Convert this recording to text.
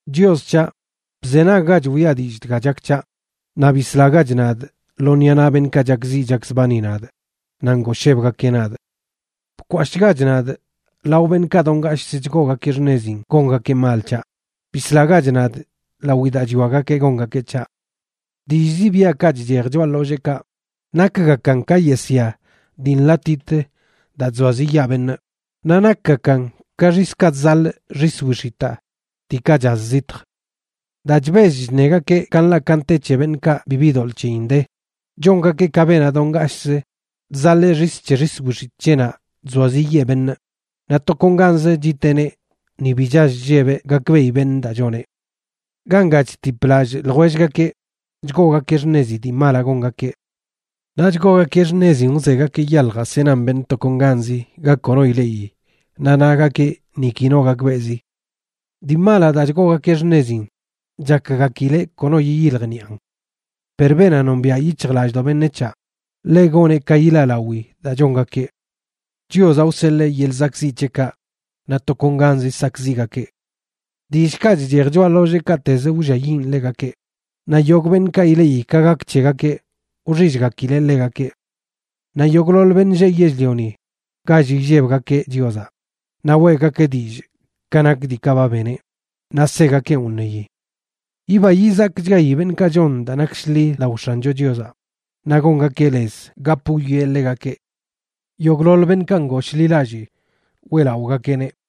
Chios c̱haꞌ, bzenaggach wiꞌa dillꞌ dga chak c̱haꞌ, naꞌ bislagach nadꞌ lo ṉiꞌa naꞌ beṉꞌkaꞌ chakziꞌ chakzbani nadꞌ naꞌ ngooshebgakeꞌ nadꞌ. Bkwashꞌgach nadꞌ lao beṉꞌkaꞌ do ngashꞌzə chgoogakeꞌ xṉezin gongakeꞌ mal c̱haꞌ; bislagach nadꞌ lawi daa chwiagakeꞌ gongakeꞌ c̱haꞌ. Dillꞌ zibiaꞌkaꞌ chchej choꞌa ḻolleekaꞌ nakgakan ka yesya dii nḻaꞌtit daa chzoaziꞌyaa beṉꞌ, naꞌ nakgakan ka xiskaꞌ chzaḻꞌ xis wix̱itaa diikaꞌ chaz zitj. Daa chbell chṉegakeꞌ ka nḻaꞌ ka nte c̱he beṉꞌkaꞌ bibi doḻꞌ c̱heyin de, chongakeꞌ ka beenaꞌ do ngashꞌzə chzaḻee xis c̱he xis wix̱itꞌ c̱heꞌnaꞌ chzoaziꞌyee beṉꞌ, naꞌ tokonganzə chiteꞌneꞌ ni bi chall chllebeꞌ gakbeꞌi beṉꞌ daa choneꞌ. Ganga chtip lallꞌ ljwellgakeꞌ chgoogakeꞌ xṉezi dii malaꞌ gongakeꞌ naꞌ chgoogakeꞌ xṉezin wzegakeꞌ yaljaꞌ senan beṉꞌ tokonganz ga kono ileꞌi, naꞌ nagakeꞌ niki no gakbeꞌzi. Dii malaꞌ daa chgoogakeꞌ xṉezin chakgakileꞌ kono yiyiljniꞌan. Per beenaꞌ nombiaꞌ yic̱hjlallꞌdoꞌ beṉec̱haꞌ, ḻeꞌ goneꞌ ka yilaꞌlawi daa chongakeꞌ. Chiozaꞌ wseḻee yeḻꞌ zakꞌziꞌ c̱heꞌkaꞌ, naꞌ tokonganzə sakꞌziꞌgakeꞌ. Dillꞌkaꞌ chchej choꞌa ḻolleekaꞌtezə wlliayiꞌn ḻegakeꞌ, naꞌ yogꞌ beṉꞌkaꞌ ileꞌi ka gak c̱hegakeꞌ wxillgakileꞌ ḻegakeꞌ. Naꞌ yogꞌḻoḻ beṉꞌ lleꞌ yell-lioni gall illebgakeꞌ Chiozaꞌ naꞌ weꞌgakeꞌ dillꞌ ka nak diikaꞌ ba beneꞌ, naꞌ segakeꞌn wṉeyi. Yiba yizakchgayi beṉꞌkaꞌ chon daa nak shḻi lao X̱ancho Chiozaꞌ, naꞌ gongakeꞌ lez gap wwieꞌ ḻegakeꞌ. Yogꞌḻoḻ beṉꞌkaꞌ ngooshḻilallii weꞌlaꞌogakeꞌneꞌ.